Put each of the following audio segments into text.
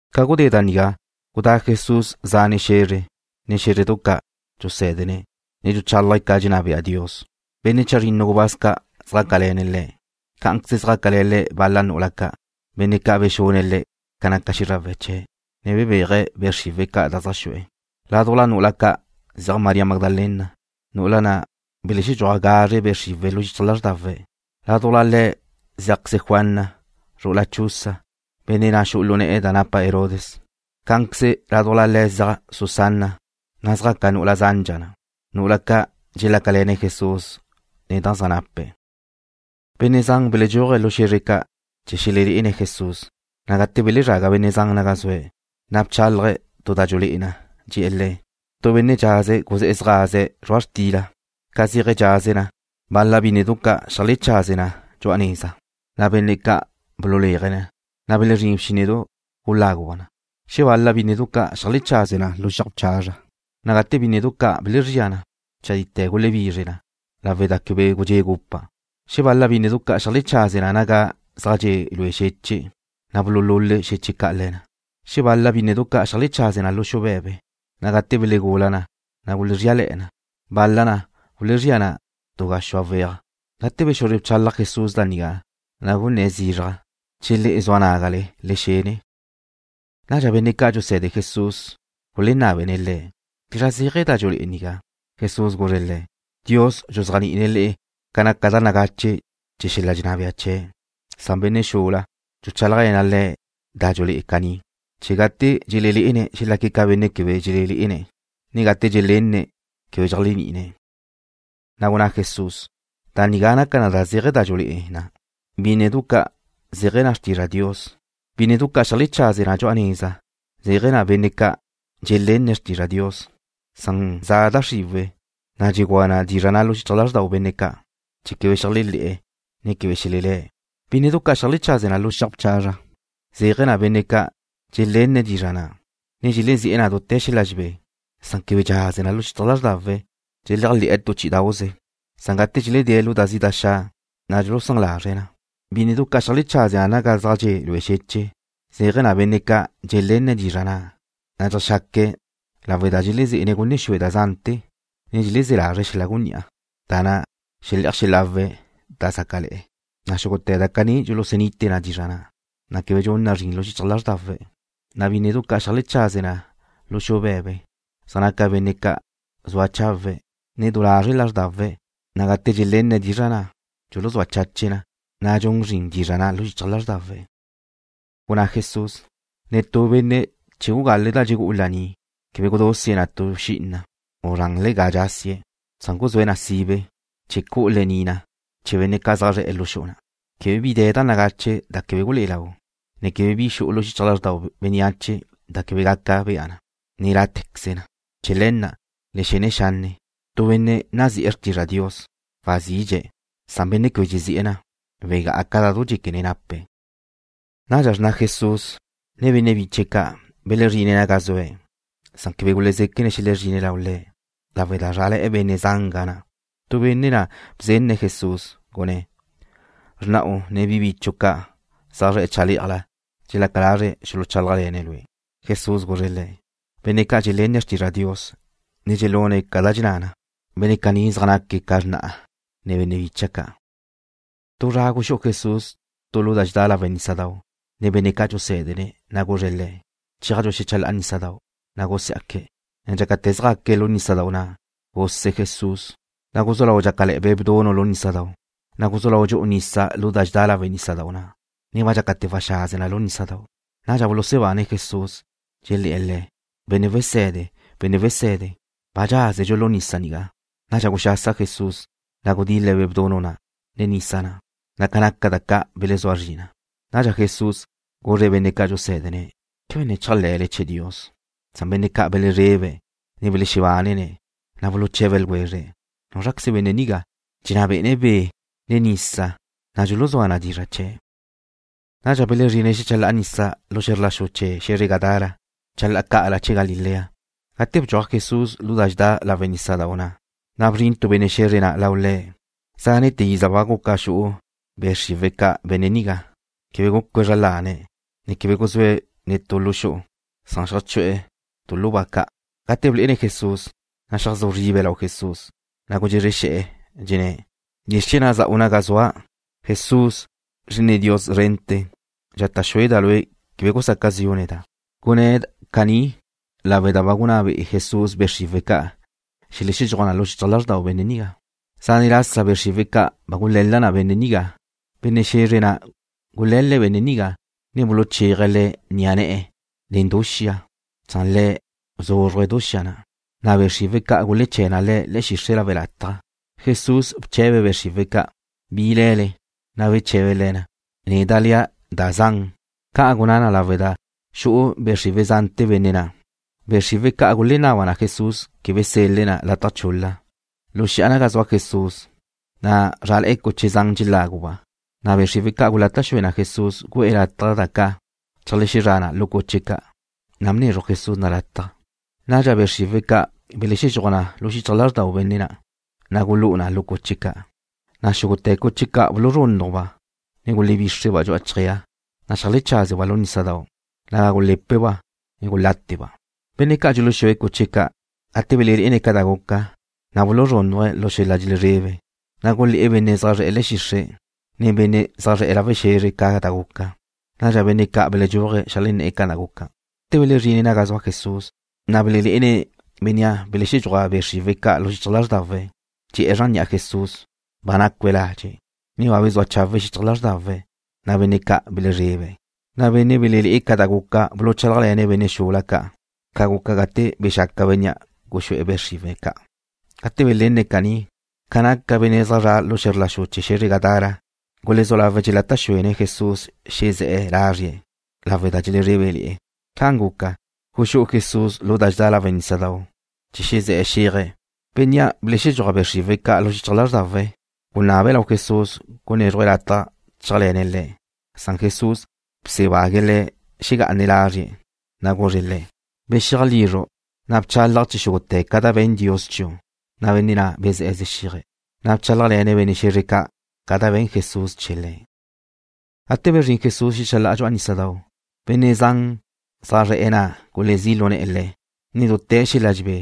Ca gudé da nigá, gudá Jesús zane' xe̱zre, ne xé̱zredu ca', dxusé̱dene̱', ne dxuchálaje̱' ca dxenná bea Dios. Benne' chazrinnu gubáz ca' zjácale̱ne̱' Le̱'. Cá'anqueze zjácale̱ Le̱' bal-la nu'ula ca', benne' ca' bexune̱' le̱' ca naca xízrawe̱' chee̱', ne bebéaje̱' be' xriwe̱' ca' da zaj xu'e̱. Ládujla nu'ula ca' ziaj María Magdalena, nu'ula na' belexedxúaj gazre be' xriwe̱' lu xichaj lázrdawe̱'. Ládujla le̱' zíajqueze Juana, zru'ula Chuza, benne' na' xu'u lu ne̱'e̱ da napa Herodes. Cá'anqueze ládujla le̱' ziaj Susana, na' zjaca nu'ula zandxa na', nu'ula ca' dxelácale̱ne̱' Jesús nen da zaj nape̱'. Benne' zan beledxúaje̱' lu xe̱zre ca' chee̱ xelelé'ene̱' Jesús, na' gate belezraga benne' zan naga zue̱', na' bchálaje̱' tu da dxulé'e na, dxe̱'e̱ le̱': ―Tu benne' dxaze̱' guzé̱'e̱ zjaze̱' zrua' xtila. Ca zéaje̱' dxaze̱' na, bal-la bínnedu ca' xeajlechaze na dxu'a neza, na' benne' ca' bululéaje̱' na, na' belezrín bxínnedau' guláguba' na. Xebal-la bínnedu ca' xeajlechaze na lu xiaj ca', na' gate bínnedu caní belezría na, chadite̱ gulebizre na, lawe' da quebe gudxé' gupa'. Xebal-la bínnedu ca' xeajlechaze na naga zaj dxe' lue xeche', na' bululule xeche' ca' le̱ na. Xebal-la bínnedu ca' xeajlechaze na lu xu be̱be, na' gate belegula na, na' gulezríale̱'e̱ na. Bal-la na gulezría na tu gaxúa weaj. Gate bexuzre bchalaj Jesús da nigá, na' gunné̱' zizraj: ―¡Che le'e zua nágale, le xene! Nadxa benne' ca' dxuse̱de Jesús gulenábene̱' Le̱' bizra zéaje̱ da dxulé'e nigá. Jesús guzre̱' le̱': ―Dios dxuzéajni'ine̱' le'e ca naca da nagache chee̱ xel-la dxenná bea chee̱', san benne' xula, dxuchálajle̱na' le̱' da dxulé'e na caní, chee̱ gate dxelelé'ene̱' xelaque̱' ca benne' quebe dxelelé'ene̱', ne gate dxelenne̱' quebe dxeléajni'ine̱'. Na' gunná Jesús: ―Da nigá naca ca zéaje̱ da dxulé'e na': Bínnedu ca' zéaje̱ na xrtizra' Dios. Bínnedu ca' xeajlechaze na dxu'a neza zéaje̱ na benne' ca' dxelenne̱' xrtizra' Dios, san za' da xriwe̱', na' dxegúa na dizra' na' lu xichaj lázrdau benne' ca', chee̱ quebe xeléajle̱'e̱, ne quebe xelelé̱'. Bínnedu ca' xeajlechaze na lu xiaj ca' zéaje̱ na benne' ca' dxelenne̱' dizra' na', ne dxelezi'e̱ na dute̱ xel-la dxelebé, san quebe dxaze na lu xichaj lázrdawe̱'. Dxeléajle̱'e̱ tu chí'idau'ze, na' gate dxeledée̱' lu da zi' da xa', na' dxulusán lazre̱' na. Bínnedu ca' xeajlechaze na naga zaj dxe' lue xeche' zéaje̱ na benne' ca' dxelenne̱' dizra' na', na' dxeajxaque̱', na' lawe' da dxeleze̱ne̱' gunne xue da zante̱, ne dxelezé̱ lazre̱' xel-la gunní'a, ne da xele'aj xelawe̱' da zácale̱'e̱, na' xúgute̱ da caní dxulusunite na dizra' na', na' quebe dxun na zrin lu xichaj lázrdawe̱'. Na' bínnedu ca' xeajlechaze na lu xu be̱be zéaje̱ na benne' ca' zua chawe', ne du lazre' lázrdawe̱', na' gate dxelenne̱' dizra' na', dxuluzúa chache̱' na, na' dxun zrin dizra' na' lu xichaj lázrdawe̱'. Gunná Jesús: ―Netú benne' che gugale̱' da dxegú'u lení', quebe gudúsie̱' na tu xi'ina, u zranle ga dxasie̱', san guzúe̱' na sibe, chee̱ cu'u lení' na chee̱ benne' zaj zre̱'e̱ lu xu'u na'. Quebe bi de̱ da nagache' da quebe gulé'e lau na, ne quebe bi xu'u lu xichaj lázrdau bénneache da quebe gaca bea na, ne lá'te̱queze na. ’Chee̱ le̱ na', le xene xanne'. Tu benne' nazi'e̱ xrtizra' Dios, wazidxe̱', san benne' quebe dxezi'e̱ na, wegá'a ca da du dxéquene̱' nape̱'. Nadxa xrna Jesús, ne benne' biche̱' ca' belezrine̱' naga zue̱', san quebe gulezéquene̱' xelezrine̱' lau Le', lawe' da zrále̱'e benne' zan ga na'. Tu benne' na' bzenne̱' Jesús, gunné̱': ―Xrna'u, ne bi bichu' ca' zaj zre̱'e̱ chale'aj nigá, dxelaca lazre̱' xuluchálajle̱ne̱' Lue'. Jesús guzre̱' le̱': ―Benne' ca' dxelenne̱' xrtizra' Dios, ne dxelune̱' ca dxenná na, benne' caní zaj naque̱' ca xrna'a, ne benne' bícha'dau' ca'. Tu zra guxú'u Jesús tu lu da dxedá lawe' nísadau' nen benne' ca' dxusé̱dene̱', na' guzre̱' le̱': ―Cheajdxu xecha la'a nísadau'. Na' gusiá'que̱', ne dxácate̱ zjaque̱' lu nísadau' na', guse Jesús. Na' guzú lau dxácale̱'e̱ be' bdunu' lu nísadau', na' guzú lau dxu'u nisa lu da dxedá lawe' nísadau' na', ne ba dxácate̱ waxaze na lu nísadau'. Nadxa bulusebane̱' Jesús, dxelé̱'e̱ Le̱': ―¡Benne' Wese̱de! ¡Benne' Wese̱de! ¡Ba dxázedxu lu nisa nigá! Nadxa guxasa Jesús, na' gudil-le̱' be' bdunu' na', ne nisa na', na' ca naca da ca' belezúa zri na. Nadxa Jesús guzre̱' benne' ca' dxusé̱dene̱': ―¿Quebe ne chéajle̱le chee̱ Dios? Benne' ca' belezrebe̱', ne belexebánene̱', na' buluche̱be ljwezre̱': ―¿Núzraqueze benne' nigá, dxenná bé'ene̱' be', ne nisa, na' dxuluzúa na dizra' chee̱'? Nadxa belezrine̱' xecha la'a nisa lu xe̱zr la xu chee̱ xe̱zre Gadara, chalá'a ca'ala chee̱ Galilea. Gate bedxúaj Jesús lu da dxedá lawe' nísadau' na', na' bzrin tu benne' xe̱zre na' lau Le̱'. Zánete̱ iza ba guca xu'u be' xriwe̱' ca' benne' nigá. Quebe gúcue̱' zra lane̱', ne quebe guzúe̱' netú lu xu'u, san xeajchu'e̱ tu lu ba ca'. Gate blé'ene̱' Jesús, na' xeajzú zribe̱' lau Le̱', na' gudxezre xe̱'e̱, dxenné̱': ―¿Bizr chee̱ na' za'u naga zua', Jesús, Zri'ine Dios szrente̱? Dxata' xueda' Lue' quebe gusaca zi'u neda'. Gunná na caní lawe' da ba gunná be'e Jesús be' xriwe̱' ca' xelexedxúaj na lu xichaj lázrdau benne' nigá. Zane' lasa be' xriwe̱' ca' ba gule̱la na benne' nigá. Benne' xe̱zre na' gule̱le̱' benne' nigá, ne buluchéaje̱' le̱' ni'a ne̱'e̱ nen du xia, san le̱' bzúzxuje̱' du xia na', na' be' xriwe̱' ca' guleché̱ na le̱' le̱'e̱ xixre' lawe' lataj. Jesús bche̱be̱' be' xriwe̱' ca': ―¿Bi le̱le? Na' beche̱be le̱ na: ―Neda' lea': Da Zan. Ca' gunná na lawe' da xu'u be' xriwe̱' zante̱ benne' na'. Be' xriwe̱' ca' gulenaba na Jesús quebe sel-le̱' na lataj chul-la. Lu xi'a naga zua Jesús, na' zrále̱'e̱ cuche zan dxeláguba', na' be' xriwe̱' ca' gulata' xue na Jesús gu'e̱ lataj da ca' cheajxezrá na lu cuche ca', na' bnezruj Jesús na lataj. Nadxa be' xriwe̱' ca' belexedxúaj na lu xichaj lázrdau benne' na', na' gulú'u na lu cuche ca', na' xúgute̱ cuche ca' buluzrúnnujba', ne gulebíxreba' dxu'a chjéa, na' xeajlecházeba' lu nísadau', naga gulé̱peba', guláteba'. Benne' ca' dxuluxúe̱' cuche ca', gate belelé'ene̱' ca da guca, na' buluzrúnnuje̱' lu xel-la dxelezrebe, na' gulé̱'e̱ benne' zaj zre̱'e̱ le̱'e̱ xixre', ne benne' zaj zre̱'e̱ lawe' xe̱zre ca da guca. Nadxa benne' ca' beledxúaje̱' xeajlenné̱'e̱ ca da guca. Gate belezrine̱' naga zua Jesús, na' belelé'ene̱' bénnea' belexedxúaj be' xriwe̱' ca' lu xichaj lázrdawe̱', dxe'e̱ zran ni'a Jesús, ba nácue̱' ladxe', ne ba bezúa chawe' xichaj lázrdawe̱', na' benne' ca' belezrebe̱'. Na' benne' belelé'e ca da guca buluchálajle̱ne̱' benne' xula ca' ca guca gate bexaca bénnea' guxú'e̱ be' xriwe̱' ca'. Gate belenne̱' caní, ca naca benne' zaj zre̱'e̱ lu xe̱zr la xu chee̱ xe̱zre Gadara gulezú lawe̱' dxelata' xúene̱' Jesús xezé̱'e̱ lazrie', lawe' da dxelezrébele̱'e̱. Ca'an guca, guxú'u Jesús lu da dxedá lawe' nísadau', chee̱ xezé̱'e̱ xéaje̱'. Bénnea' belexedxúaj be' xriwe̱' ca' lu xichaj lázrdawe̱' gunabe̱' lau Jesús gunézruje̱' lataj chéajle̱ne̱' Le̱', san Jesús busebague̱' le̱' xegá'ane̱' lázrie̱', na' guzre̱' le̱': ―Bexiaj lizru', na' bchalaj chee̱ xúgute̱ ca da ba be̱n Dios chiu'. Na' benne' na' bezé̱'e̱ zexíaje̱', na' bchálajle̱ne̱' benne' xe̱zre ca' ca da be̱n Jesús chee̱ le̱'. Gate bezrín Jesús xecha la'a dxu'a nísadau', benne' ca' zaj zre̱'e̱ na' gulezí' lu ne̱'e̱ Le̱' nen dute̱ xel-la dxelebé,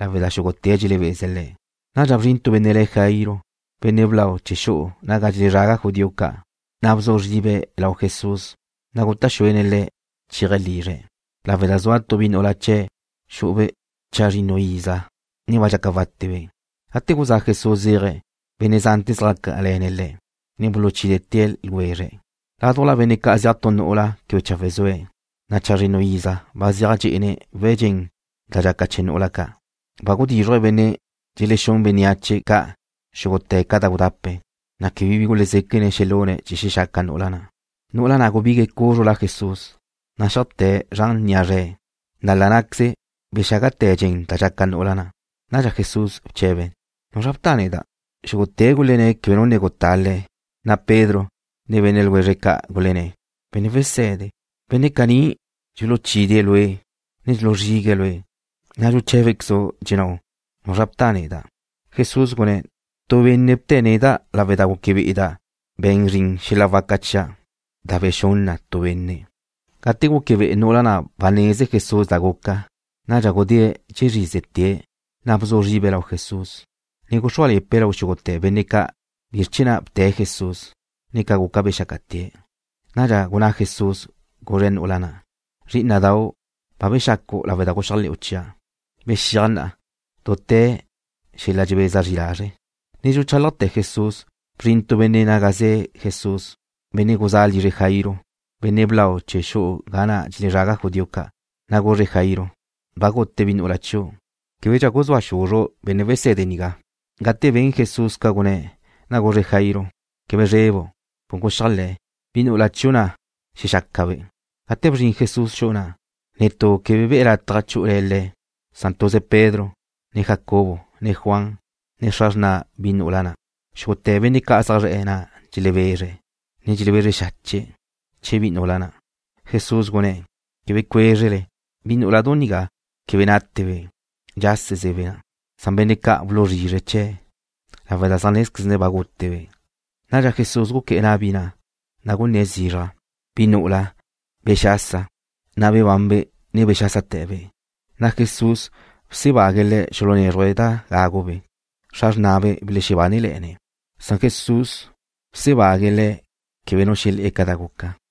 lawe' da xúgute̱' dxelebeze̱' Le̱'. Nadxa bzrin tu benne' le̱' Jairo, benne' blau chee̱ xu'u naga dxelezraga judío ca', na' bzu zribe̱' lau Jesús, ne guta' xúene̱' Le̱' chéaje̱' lizre̱', lawe' da zua tuze bi nu'ula chee̱'. Xu'ube' chazrinnu iza, na' ba dxaca wátebe'. Gate guzá' Jesús zéaje̱', benne' zante̱ zjácale̱ne̱' Le̱', ne buluchídete̱ ljwezre̱'. Ládujla benne' ca' zeaj tu nu'ula quebe chawe' zue̱', na' chazrinnu iza ba zeaj dxé'ene̱' we̱' dxen da dxaca chee̱ nu'ula ca'. Ba gudízruje̱' benne' dxelexún bénneache ca' xúgute̱ ca da gudape̱', na' quebe bi gulezéquene̱' xelune̱' chee̱ xexaca nu'ula na'. Nu'ula na' gubigue̱' cúzrula Jesús, na' xeajté̱' zran ni'a zre̱', na' la ná'queze bexágate̱ dxen da dxaca nu'ula na'. Nadxa Jesús bche̱be̱': ―¿Nuzra bta neda'? Xúgute̱' gulenné̱': “Quebe nu ne gutá Lue'”, na' Pedro, ne benne' ljwezre̱' ca' gulenné̱': ―Benne' Wese̱de, benne' caní dxuluchídee̱' Lue', ne dxuluzrigue̱' Lue', na' dxuché̱bequezu', dxennáu': “¿Nuzra bta neda'?” Jesús gunné̱': ―Tu benne' bte̱' neda' lawe' da gúquebe'eda' ben zrin xel-la waca chia' da bexún na tu benne'. Gate gúquebe'e nu'ula na' ba neze Jesús da guca, nadxa gudée̱' dxezrízete̱', na' bzu zribe̱' lau Jesús, ne guxrúale̱pe̱' lau xúgute̱ benne' ca' bizr chee̱ na' bte̱' Jesús, ne ca guca bexácate̱'. Nadxa gunná Jesús, guzre̱' nu'ula na': ―Zrí'ina'dau', ba bexacu' lawe' da guxéajle̱'u chia'. Bexíaj na'a, dute̱ xel-la dxebeza zri lazre'. Ne dxuchálajte̱ Jesús, bzrin tu benne' naga ze̱ Jesús, benne' guzé̱'e̱ lizre Jairo, benne' blau chee̱ xu'u ga na' dxelezraga judío ca', na' guzre̱' Jairo: ―Ba gute bi nu'ula chiu'. Québedxa guzúa xuzru' Benne' Wese̱de nigá. Gate ben Jesús ca gunné̱', na' guzre̱' Jairo: ―Quebe zrebu'. Con guxeajle̱. Bi nu'ula chiu' na' xexácabe'. Gate bzrin Jesús xu'u na', netú quebe be̱' lataj chú'ule̱ Le̱', san tuze Pedro, ne Jacobo, ne Juan, ne xra xrna bi nu'ula na'. Xúgute̱ benne' zaj zre̱'e̱ na' dxelebezre̱', ne dxelebezre xache̱' chee̱ bi nu'ula na'. Jesús gunné̱': ―Quebe cuézrele. Bi nú'uladu nigá quebe nátebe'. Dxásezebe' na'. Na' benne' ca' buluzrizre̱' chee̱', lawe' da zaj nézquezne̱' ba gútebe'. Nadxa Jesús guqué̱'e̱ na' bi na', na' gunné̱' zizraj: ―¡Bi nu'ula, bexasa! Na' bebanbe', ne bexásate̱be'. Na' Jesús busebague̱' le̱' xulunézruje̱' da gágube'. Xra xrnabe' belexebánele̱'e̱ne̱'. Jesús busebague̱' le̱' quebe nu xelé̱'e̱ ca da guca.